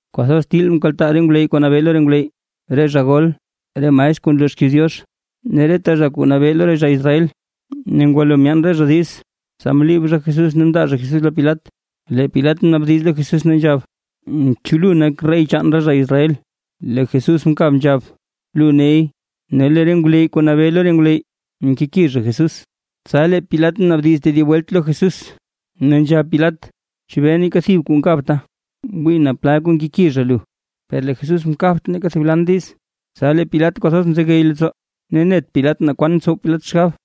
Kwathoz til mkaltaa re ngwleyy kuu nabee lo re ngwleyy, re zha gol, re maestr kuu nloo xkiiz Diox, ne reta zha kuu nabee lo re zha Israel. Ne ngwalo myaan re zha diiz, tsa mliib zha Jesús ne mndaa zha Jesús lo Pilat. Lee Pilat mnaabdiz lo Jesús ne nzhab: ―¿Chu lu nak rey chaan re zha Israel? Lee Jesús mkab nzhab: ―Lu ney. Ne lee re ngwleyy kuu nabee lo re ngwleyy mkeki zha Jesús. Tsa lee Pilat mnaabdiz tedib welt lo Jesús ne nzhab Pilat: ―¿Chebee neeka thib kuu nkabta? ¡Wii naa plal kuu nkeki zha lu! Per lee Jesús mkabt neeka thib lan diiz. Tsa lee Pilat kwathoz mzegey leettsoo ne net Pilat naa kwan tsow Pilat xgab.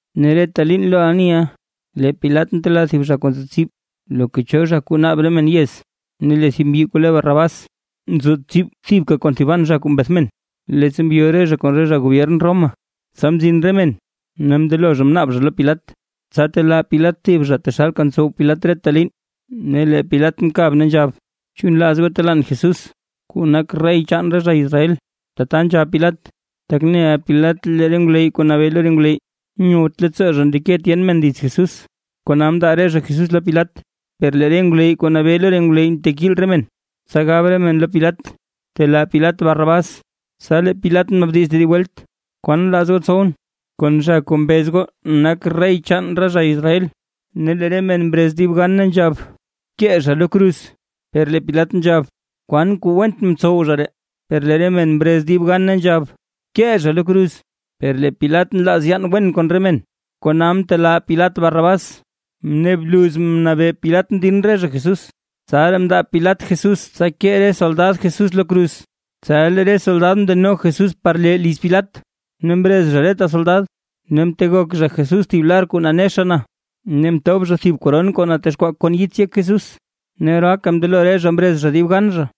Ne reta liin lo aniʼa lee Pilat ntelaa thib zha kuu nzo tsib, loka cho zha kuu naab re men yez. Ne lee thib mbyi kuu le Barrabás, nzo tsib thibka kon thiban zha kuu mbeth men, leettsa mbyo re zha kon re zha gobyern Roma. Tsa mzin re men, ne mndelo zha mnaab zha lo Pilat, tsa telaa Pilat thib zha taxalka ntsow Pilat reta liin. Ne lee Pilat mkab ne nzhab: ―¿Chu nlaaz goo telaan Jesús, kuu nak rey chaan re zha Israel? Tata nzhab Pilat, tak neʼa Pilat lee re ngwleyy kuu nabee lo re ngwleyy, nyowt leettsoo zha ndeke tyen men dits Jesús, kona mndaa re zha Jesús lo Pilat. Per lee re ngwleyy kuu nabee lo re ngwleyy mtekiil re men, tsa gab re men lo Pilat telaa Pilat Barrabás. Tsa lee Pilat mnaabdiz tedib welt: ―¿Kwaan nlaaz goo tsowʼn, kon zha kuu mbez goo nak rey chaan re zha Israel? Ne lee re men mrez dib gan ne nzhab: ―¡Bkee zha lo kruz! Per lee Pilat nzhab: ―¿Kwaan kuu went mtsow zha ree? Per lee re men mre mrez dib gan ne nzhab: ―¡Bkee zha lo kruz! Per lee Pilat nlaaz yaan wen kon re men, kona mtelaa Pilat Barrabás, ne bluz mnabee Pilat mdin re zha Jesús, tsaraa mndaa Pilat Jesús, tsa kee re soldad Jesús lo kruz. Tsa lee re soldad mndeno Jesús par lee liz Pilat, ne mrez zha reta soldad. Ne mtegok zha Jesús thib lar kuu nanexa na, ne mtob zha thib koron kuu natexkwaa kon yits yek Jesús. Ne oraaka mndelo re zha mrez zha dib gan zha,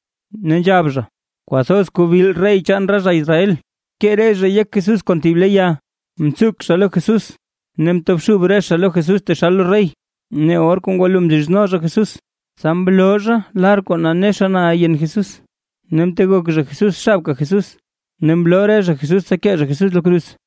ne nzhab zha: ―¡Kwathoz kuubil rey chaan re zha Israel! Mkee re zhay yek Jesús kon thib le ya, mtsuk zha lo Jesús ne mtobxub re zha lo Jesús taxal lo rey. Ne or kuu ngwalo mzhizno zha Jesús, tsa mloo zha lar kuu nanexa na yen Jesús, ne mtegok zha Jesús xabka Jesús, ne mloo re zha Jesús tsa kee zha Jesús lo kruz.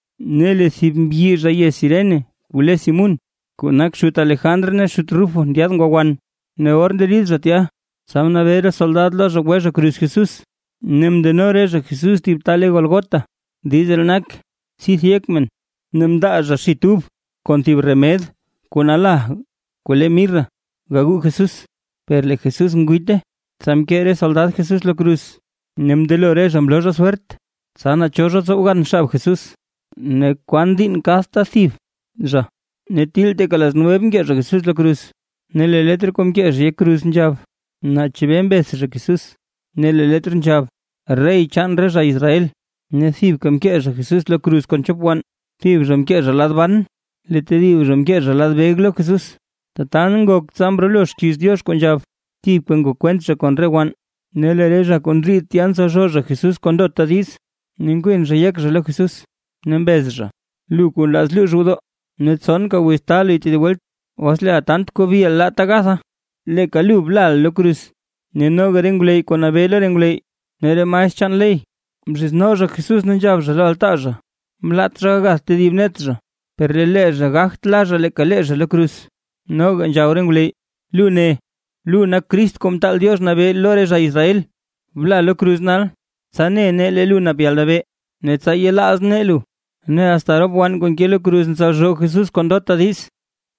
Ne lee thib mbyi zha yez Cirene kuu le Simún, kuu nak xut Alejandr ne xut Rufo ndyaad ngwa wan. Ne or nderid zha tya, tsa mnabee re soldad lo zha gwe zha kruz Jesús. Ne mndeno re zha Jesús thib ta le Gólgota. (Diiz ree nak: “Tsidth yek men”.) Ne mndaa zha xit ub kon thib remed kuu nala kuu le mirra gagu Jesús, per lee Jesús ngwiite. Tsa mkee re soldad Jesús lo kruz. Ne mndelo re zha mloo zha swert, tsa naa cho zha tsow gan xab Jesús, ne kwan kuu diinn kadta thib zha. Ne til teeka las nueve mkee zha Jesús lo kruz. Ne lee letr kuu mkee zha yek kruz nzhab, naa chebee mbeth zha Jesús, ne lee letr nzhab “REY CHAAN RE ZHA ISRAEL”. Ne thibka mkee zha Jesús lo kruz kon chop wann, thib zha mkee zha lad ban lee tedib zha mkee zha lad beg lo Jesús. Tata ngok tsa mrolo xkiiz Diox kuu nzhab: “Thibka ngok kwent zha kon re wann”. Ne lee re zha kuu ndriid tya ntsalzhoo zha Jesús kon ndota diiz, ne nkwin zha yek zha lo Jesús, ne mbez zha: ―¡Lu kuu nlaaz luux gwodoo, ne tsonka wiz taa luy tedib welt, os leeʼa kwathoz kuubiʼa laata gatha, leeka lu blaʼa lo kruz! Ne noga re ngwleyy kuu nabee lo re ngwleyy ne re maestr chaan ley, mzhizno zha Jesús ne nzhab zha lo altaa zha: ―Mlaat zha gagath tedib net zha, per lee zha gagt la zha leeka lee zha lo kruz. Noga nzhab re ngwleyy: ―Lu ne: Lu nak Crist Kuu Mtaal Diox nabee lo re zha Israel. Bla lo kruz nal, tsa ne nee lee lu nap yalnabee, ne tsa yelaaz nee lu. Ne asta rop wann kuu nke lo kruz ntsalzhoo Jesús kon ndota diiz.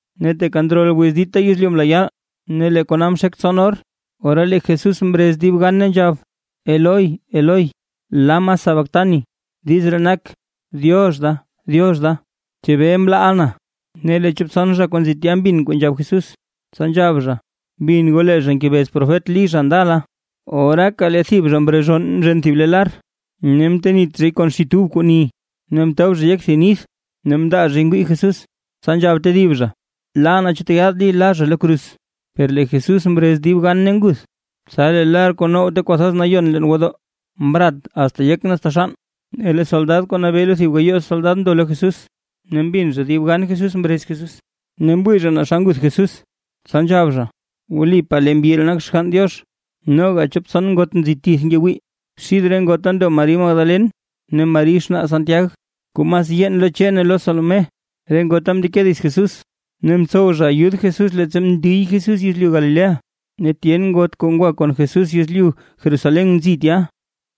Ne teeka ndrol wiz dita yezlyu mla yaal, ne lee kona mxek tson or. Ora lee Jesús mrez dib gan ne nzhab: ―Eloi, Eloi, ¿lama sabactani? (Diiz ree nak: “Diox da, Diox da, ¿chebee mlaaʼa na?”) Ne lee chop tson zha kuu nzi tya mbin kuu nzhab Jesús, tsa nzhab zha: ―Bin goo, lee zha ngebez profet Lí zha ndala. Oraaka le thib zha mrezhonn mzhen thib le lar, ne mtenit zhay kon xit ub kuu ni, ne mtob zhay yek thib nith ne mndaa zhay ngwii Jesús. Tsa nzhab tedib zha: ―Laa, naa chu tyaad Lí la zha lo kruz. Per lee Jesús mrez dib gan ne nguth. Tsa lee lar kuu now Ta Kwathoz Nayon leen gwodoo mrat asta yek ne asta xann. Ne lee soldad kuu nabee lo thib gayoo soldad ndo lo Jesús, ne mbin zha dib gan Jesús mrez Jesús ne mwii zha naa xa nguth Jesús. Tsa nzhab zha: ―Wlipaa lee mbyi ree nak Xgann Diox. Noga chop tson ngot nzi tith ngewii, xid re ngota ndo Mari Magdalen ne Mari xnaa Santiag kuu mas yeen lo Che ne lo Salomé. Re ngota mndeke dits Jesús, ne mtsow zha ayud Jesús leettsa mndiy Jesús yezlyu Galilea. Ne tyen ngot kuu ngwa kon Jesús yezlyu Jerusalén nzi tya.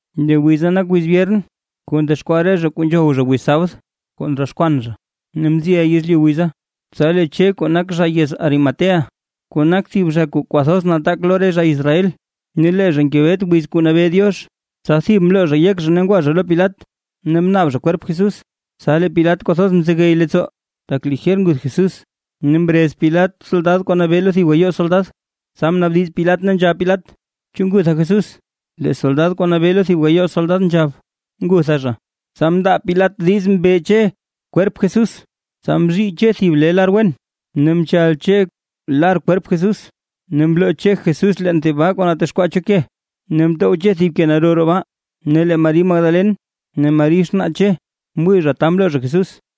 Lee wiza nak wiz byern kuu ndexkwaa re zha kuu nzhow zha wiz sabd kuu ndroxkwan zha. Ne mziʼa yezlyu wiza, tsa lee Che kuu nak zha yez Arimatea, kuu nak thib zha kuu kwathoz nataak lo re zha Israel, ne lee zha ngebet wiz kuu nabee Diox. Tsa thib mloo zha yek zha ne ngwa zha lo Pilat. Ne mnaab zha kwerp Jesús. Tsa lee Pilat kwathoz mzegey leettsoo, tak lijer nguth Jesús ne mrez Pilat soldad kuu nabee lo thib gayoo soldad, tsa mnaabdiz Pilat ne nzhab Pilat: ―¿Chu ngutha Jesús? Lee soldad kuu nabee lo thib gayoo soldad nzhab: ―Ngutha zha. Tsa mndaa Pilat diiz mbe Che kwerp Jesús. Tsa mzhii Che thib lar wen, ne mchal Che lar kwerp Jesús, ne mloo Che kwerp Jesús leen thib baa kuu natexkwaa cho ke, ne mtow Che thib ke naro roo baa. Ne lee Mari Magdalen ne Mari xnaa Che mwii zha ta mloo zha Jesús.